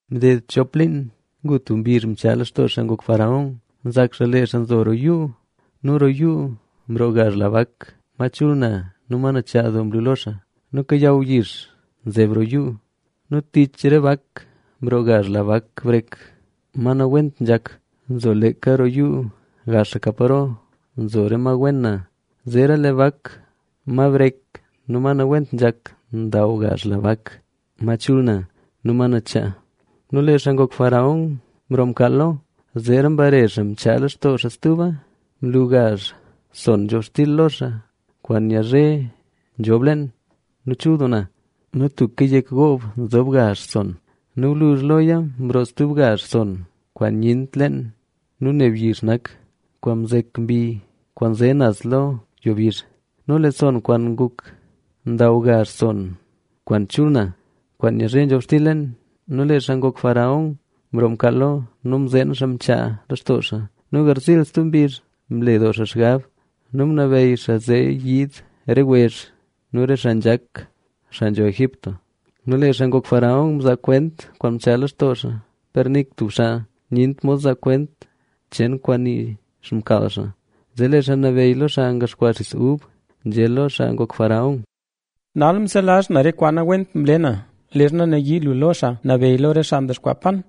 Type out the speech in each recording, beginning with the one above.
Mded chop liin, ngu tub mbizh mchaa lextoo xaa ngok faraón. Nzak xaa lee xaa nzo roo yuu. Nu roo yuu mroo gazh la bak, ma chul na nu nachaa doo mlu lo xaa, ma kayaw yix nzeb roo yuu. Nu tich re bak, mroo gazh la bak brek, ma nawent nzhak, ma nzo leeka roo yuu gaxaka paro nzo re ma wen na. Zeera lee bak ma brek nu nawent nzhak ndaw gazh la bak ma chul na nu ma nachaa. Nu lee xaa ngok faraón mroo mkaal lo, zeera mbare xaa mchaa lextoo xaa stuba. Mlu gazh sonn nzhobxtil lo xaa kwaan nyazhe nzhob leen nu chul doo na. Nu tuka yek goob nzob gazh sonn. Nu gwluzh loya mroo stub gazh sonn kwaan nyent leen nu neb yix nak, kwaan mzek mbi kwaan nze naz lo yo bizh. Nu lee sonn kwaan nguk ndaw gazh sonn kwaan chul na, kwaan nyazhe nzhobxtil leen. Nu lee xaa ngok faraón mroo mkaal lo nu zee mzeen xaa goka tub mkaal. Nu garziil stub mbizh, mle doo xaa xgab nu ngunabeyy xaa, zee yiid re wezh nu re xaa nzhak, xaa nzho Egipto. Nu lee xaa ngok faraón mzaa kwent kwaan mchaa lextoo xaa, per nik tub xaa nyent mod zaa kwent cheen kwaan nii xmkaal xaa. Zee lee xaa nabeyy lo xaa ngaxkwaa xis ub nzhé lo xaa ngok faraón: —Nal mselazh na re kwaan nawent mle na. Leezha nayii lu lo xaa nabeyy lo re xaa ngaxkwaa yat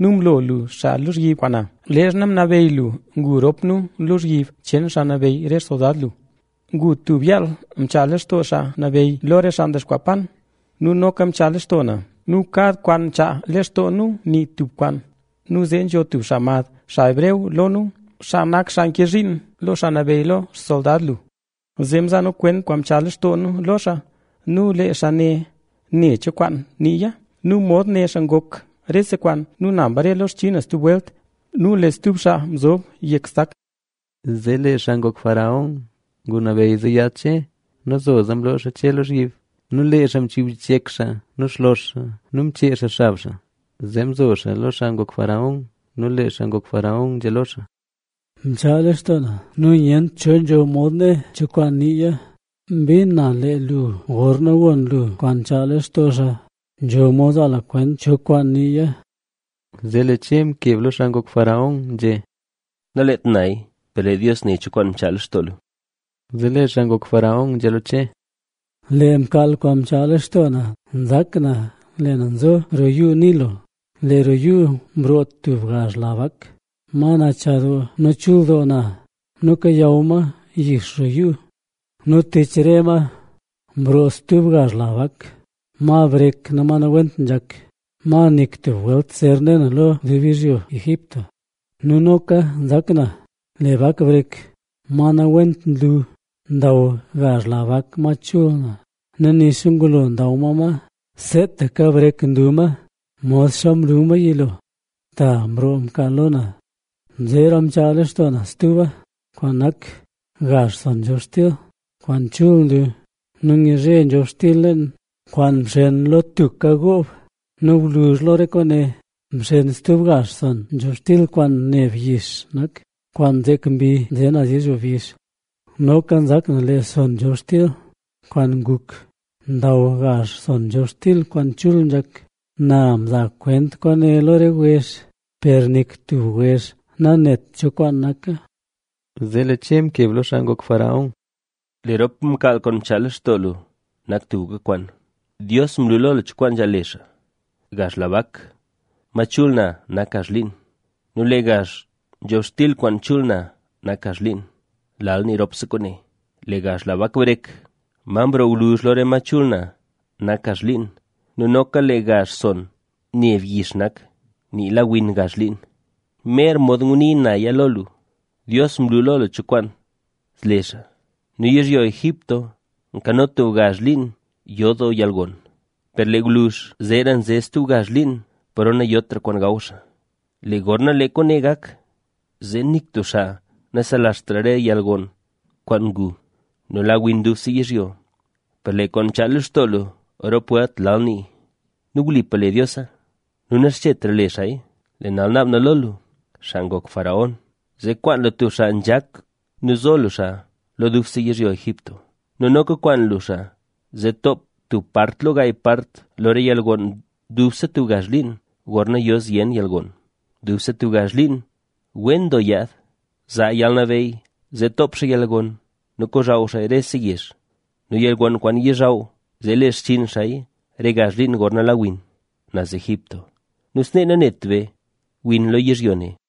nu mlo lu xaa lozhyib kwaan na, leezha ngunabeyy lu ngu rop nu lozhyib cheen xaa nabeyy re xsoldad lu. Ngu tub yaal mchaa lextoo xaa nabeyy lo re xaa ngaxkwaa yat nu noka mchaa lextoo na. Nu kad kwaan mchaa lextoo nu nii tub kwaan. Nu zee nzho tub xaa mad, xaa hebreo, lo nu, xaa nak xaa nke zhiin lo xaa nabeyy lo xsoldad lu. Zee mzaa nu kwent kwaan mchaa lextoo nu lo xaa nu lee xaa ne né cho kwaan niiya. Nu mod né xaa ngok rese kwaan; nu na mbare lo xchinn na stub welt nu lee stub xaa mzob yek stak. Zee lee xaa ngok faraón ngunabeyy zee yaad Che. Nu zoza mloo xaa Che lozhyib. Nu lee xaa mchub yichyek xaa nu xlox xaa nu mchee xaa xab xaa, zee mzo xaa lo xaa ngok faraón. Nu lee xaa ngok faraón nzhé lo xaa: —Mchaa lextoo na nu nyent cho nzho mod né cho kwaan niiya. Mbin na lee lu gorna gon lu kwaan nchaa lextoo xaa, nzho mod zaa lu kwent cho kwaan niiya. Zee lee Che mkeb lo xaa ngok faraón nzhé: —Nalet naya, per lee Dios né cho kwaan mchaa lextoo lu. Zee lee xaa ngok faraón nzhé lo Che: —Lee mkaal kwaan mchaa lextoo na nak, nzak na lee na nzo roo Yuu Nilo. Nu lee roo yuu mroo tub gazh la bak, ma nachaa doo nu chul doo na nu kayaw ma yix roo yuu. Nu tich re ma, mroo stub gazh la bak, ma brek nu ma nawent nzhak, ma nik tub welt zer ne na lo dub yizhyo Egipto. Nu noka nzak na, lee bak brek ma nawent nlu, ndaw gazh la bak ma chul na. Nu nixa ngulo ndaw ma ma, seetaka brek nlu ma modxa mlu ma yilo. Ta mroo mkaal lo na. ’Zeera mchaa lextoo na stuba kwaan nak, gazh sonn nzhobxtil, kwaan chul nlu nu nyazhe nzhobxtil leen, kwaan mxen lo tuka goob. Nu gwluzh lo re kwaane mxen stub gazh sonn nzhobxtil kwaan neb yix nak, kwaan mzek mbi kwaan nze naz yizhyo bizh. Noka nzak na, lee sonn nzhobxtil kwaan nguk ndaw gazh sonn nzhobxtil kwaan chul nzhak. Na mza kwent kwaane lo re wezh, per nik tub wezh nanet cho kwaan naka. Zee lee Che mkeb lo xaa ngok faraón: —Lee rop mkaal kwaan mchaa lextoo lu nak tubka kwaan. Dios mlu lo lu cho kwaan nzhaal le xaa. Gazh la bak ma chul na nak gazh liin nu lee gazh nzhobxtil kwaan chul na nak gazh liin, lal nii ropse kwaane. Lee gazh la bak brek, ma mroo gwluzh lo re ma chul na nak gazh liin nu noka lee gazh sonn neb yix nak, mzek mbi kwaanzee naz pa nlen mbizh. Nii la win gazh liin. Mer mod ngunii naya lo lu, Dios mlu lo lu cho kwaan le xaa. Nu yizhyo Egipto kano tub gazh liin yo doo yalgon. Per lee gwluzh, zeera nze stub gazh liin paro nayotra kwaan gaw xaa. Lee gorna lee kwaane gak, zee nik tub xaa naselazht re yalgon kwaan ngu; nu la win dubse yizhyo. Per lee kwaan mchaa lextoo lu rop welt lal niiya. Nu wlipa le Diosa; nu naxchetra le xaaya. ’Lee nal naab na lo lu, zee kwaan lu tub xaa nzhak nu zo lu xaa lo dubse yizhyo Egipto. Nu noka kwaan lu xaa zee toop xaa, tub part lo gaay part lo re yalgon dubse tub gazh liin, gorna yo zyen yalgon. Dubse tub gazh liin wen doo yaad, zaa yalnabeyy zee toop xaa yalgon nu kozhaw xaaya rese yezh. Nu yalgon kwaan yizhaw zee, le xchinn xaaya re gazh liin gorna la win naz Egipto. Nu snee nanet be win lo yizhyo ne.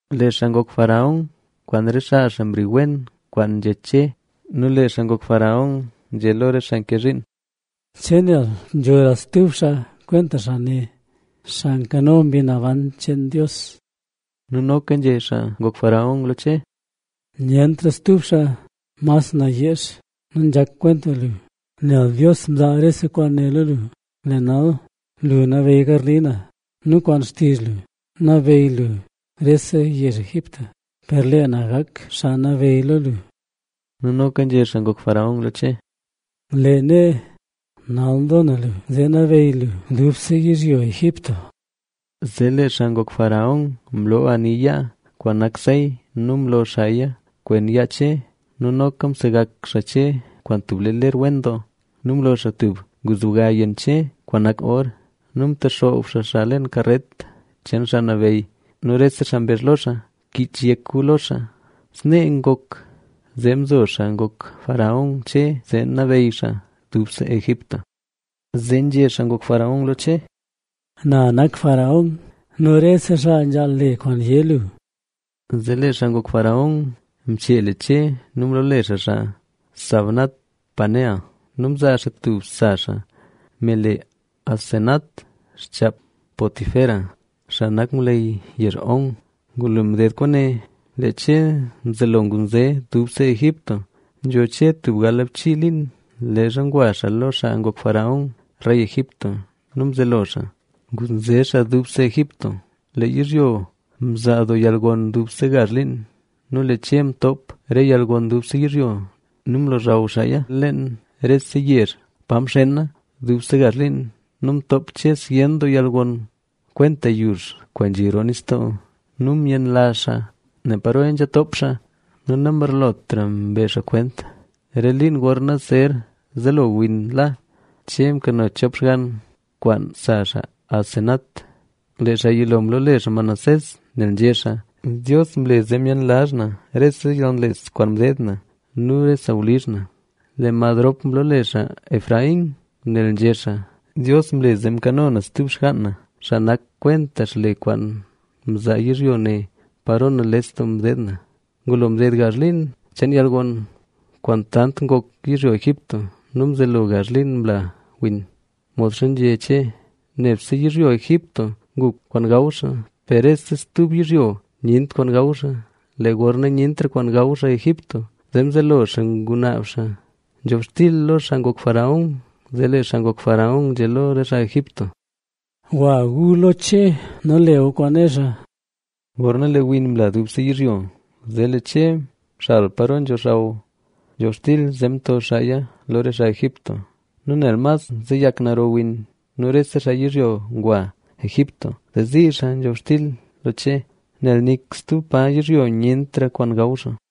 Lee xaa ngok faraón nu re xaa xaa mwii wen nak kwaan nzhé Che. Nu lee xaa ngok faraón nzhé lo re xaa nke zhiin: —¿Che nel nzhora stub xaa kwenta xaa ne, xaa nkano Mbi Naban cheen Dios? Nu noka nzhé xaa ngok faraón lo Che: —Nyentra stub xaa mas nayeex nu nzhak kwenta lu, nel Dios mzaa rese kwaane lo lu. Lee nal, lu nabeyy garli na nu kwaan xtizh lu nabeyy lu rese yezh Egipto, per lee na gak xaa nabeyy lo lu. Nu noka nzhé xaa ngok faraón lo Che: —Lee nee, nal mzo na lu zee nabeyy lu dubse yizhyo Egipto. Zee lee xaa ngok faraón mloo ani yaa kwaan nak sey nu mlo xaaya kwen yaa Che. Nu noka msegak xaa Che kwaan tub ler wen doo; nu mlo xaa tub nguzbga yenn Che kwaan nak or. Nu mtexoob xaa xaa leen karet, cheen xaa nabeyy nu rese xaa mbezh lo xaa: “Kich yek gu lo xaa”. Snee ngok zee mzo xaa ngok faraón Che, zee nabeyy xaa dubse Egipto. Zee nzhé xaa ngok faraón lo Che: —Na nak faraón nu rese xaa nzhaal le kwaan yé lu. Zee lee xaa ngok faraón mchee le Che nu mloole xaa xaa Zafnat-panea nu mzaa xaa tub sa xaa, me le Asenat xchaap Potifera, xaa nak ngwleyy yezh On. Ngulo mded kwaane lee Che mzelo ngunze dubse Egipto. Nzho Che tub galbchii liin leezha ngwa xaa lo xaa ngok faraón, rey Egipto; nu mzelo xaa ngunze xaa dubse Egipto. Lee yizhyo mzaa doo yalgon dubse gazh liin. Nu lee Che mtoop re yalgon dubse yizhyo nu mlochaw xaaya leen rese yezh pa mxena dubse gazh liin. Nu mtoop Che zyen doo yalgon kwenta yux kwaan nzhi roo nistoo nu myenlazh xaa ne paroya nzha toop xaa. Nu namgarlotra mbe xaa kwent. Re liin gorna zer zelo win la, Che mkano chop xgann kwaan sa xaa Asenat. Lee xaa yilo mloole xaa Manasés,a nel nzhé xaa: “Dios mle zee myenlazh na rese yalnales kwaan mdeed na nu re sawlizh na”. Lee mad rop mloole xaa Efraín,b nel nzhé xaa: “Dios mle zee mkano na stub xgaan na, xaa nak kwenta xle kwaan mzaa yizhyo ne paro nales doo mdeed na”. Ngulo mded gazh liin cheen yalgon kwaan tant ngok yizhyo Egipto nu mzelo gazh liin mla win, modxa nzhé Che. Nebse yizhyo Egipto ngu kwaan gaw xaa, per rese stub yizhyo nyent kwaan gaw xaa. Lee gorna nyentra kwaan gaw xaa Egipto, zee mzelo xaa ngunaab xaa nzhobxtil lo xaa ngok faraón. Zee lee xaa ngok faraón nzhé lo re xaa Egipto: —Gwa gu lo Che nu le gu kwaan né xaa. Gorna lee win mla dubse yizhyo, zee lee Che mxal paro nzhozhaw nzhobxtil, zee mto xaaya lo re xaa Egipto nu nel mas nzeyak naro win. Nu rese xaa yizhyo ngwa Egipto, zee zii xaa nzhobxtil lo Che, nel nik stub pa yizhyo nyentra kwaan gaw xaa.